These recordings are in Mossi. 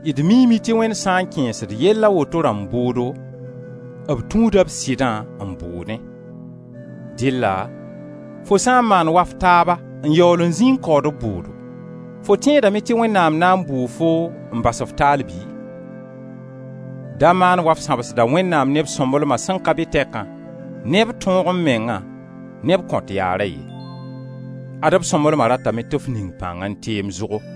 D miime tɩ Wẽnd sã n kẽesd yell a woto rãmb bʋʋdo, b tũuda b sɩdã n bʋʋdẽ. Dɩlla fo sã n maand wa f taaba n yaool n zĩ n kaood b bʋʋdo, fo tẽedame tɩ Wẽnnaam na bʋ foo n bas-f taal bɩ? Da maan wa f sãbsda Wẽnnaam ne b sõmblema sẽn ka be tɛkã, ne b tõog-m-mengã, ne b kõt-yaara ye; ad-b sõmblema ratame tɩ f ning pãng n teem zʋgo.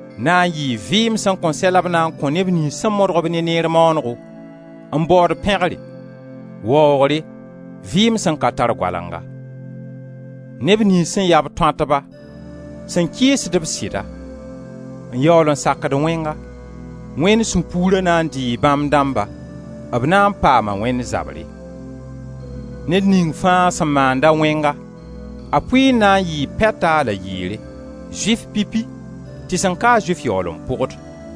Na n yɩɩ vɩɩm sẽn kõn sɛ la b na n kõ neb niyns sẽn modg-b ne neer maanego, n baood pẽgre, waoogre, vɩɩm sẽn ka tar goalenga. Neb niyns sẽn ya-b tõatba, sẽn kɩɩsd-b sɩda, n yaool n sakd wẽnga, Wẽnd sũ-puura na n dɩɩ bãmb dãmba, b na n paama Wẽnd zabre. Ned ning fãa sẽn maand-a wẽnga, a pʋɩɩr na n yɩɩ pɛta la yɩɩre, Zʋɩf pipi, tɩ sẽn ka-a Zʋɩf yaool n pʋgd.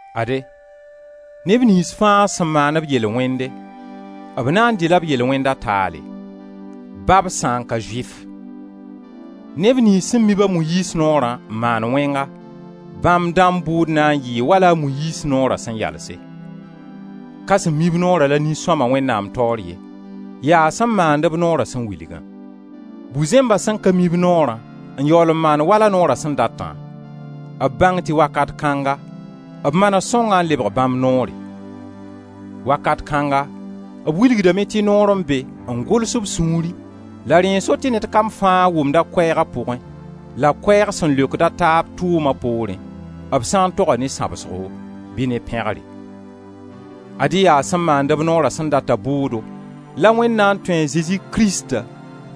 Ade, neb niyns fãa sẽn maan-b yel-wẽnde, b na n dɩ-la b yel-wẽnda taale, ba b sã n ka Zʋɩf. Neb niyns sẽn mi-b a Moyiiz Noorã n maan wẽnga, bãmb dãmb bʋʋd na n yɩɩ wala a Moyiiz Noora sẽn yalse. Ka sẽn mi-b noora la nin-sõma, Wẽnnaam taoor ye, yaa sẽn maand-b noora sẽn wilgã. Bu-zẽmba sẽn ka mi-b Noorã n yaool n maand wala Noora sẽn datã, b bãng tɩ wakat kãnga b manes sõngã n lebg bãmb noore, wakat kãnga b wilgdame tɩ noor n be n gʋls b sũurẽ la rẽ n so tɩ ned kam fãa wʋmd koɛɛg a pʋgẽ, la koɛɛg sẽn leokd d taab tʋʋma poorẽ, b sã n toga ne sãbsgo bɩ ne pẽgre. Ad-y yaa sẽn maand-b Noora sẽn data bʋʋdo la Wẽnd na n tũ a Zezi Krista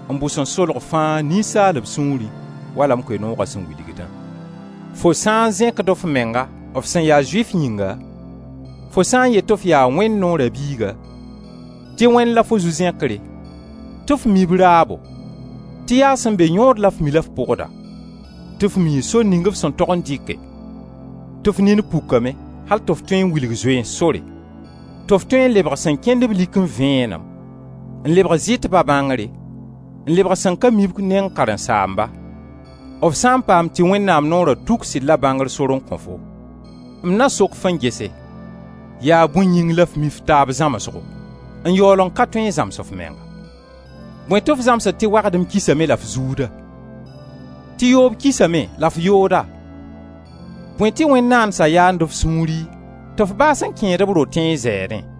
n bʋ sẽn solg fãa ninsaalb sũurẽ, wala m Koe-nooga sẽn wilgdã. Fo sã n zẽkd f menga, f sẽn ya Zʋɩf yĩnga, fo sã n yet tɩ f yaa Wẽnd Noora biiga, tɩ Wẽnd la fo zu-zẽkre, tɩ f mii b raabo, tɩ yaa sẽn be yõod la f mi la f pʋgda, tɩ f mii sor ning f sẽn tog n dɩke, tɩ f nin pukame, al tɩ f tõe n wilg zoeens sore, tɩ f tõe n lebg sẽn kẽnd-b likẽ vẽenem, n lebg zɩtba bãngre, n lebg sẽn ka mib neng karen-saamba, f sã n paam tɩ Wẽnnaam Noora tuk sɩd la bãngr sor n kõ-fo, m na sok-f n gese, yaa bõe yĩng la f mi f taab zãmsgo n yaool n ka tõe n zãms f menga? Bõe tɩ f zãmsd tɩ wagdem kisame la f zuuda? Ti yoob kisame, la f yooda? Bõe tɩ wẽn-naandsa yaand f sũuri tɩ f baas n kẽed b rotẽ n zɛɛdẽ?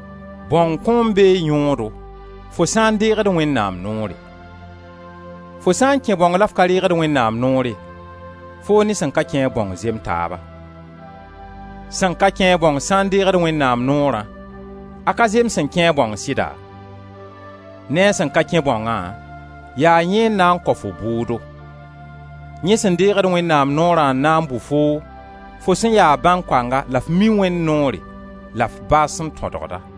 Bãong kõom bee yõodo fo sã n deegd Wẽnnaam noore; fo sã n kẽ bãong la f ka reegd Wẽnnaam noore, foo ne sẽn ka kẽ-a bãong zem taaba. Sẽn ka kẽ-a bãong sã n deegd Wẽnnaam noorã, a ka zem sẽn kẽ-a bãong sɩda? Ne a sẽn ka kẽ bãongã, yaa yẽ n na n kao fo bʋʋdo; yẽ sẽn deegd Wẽnnaam noorã n na n bʋ foo, fo sẽn ya bãnkoanga la f mi Wẽnd noore la f baas n tõdgd-a.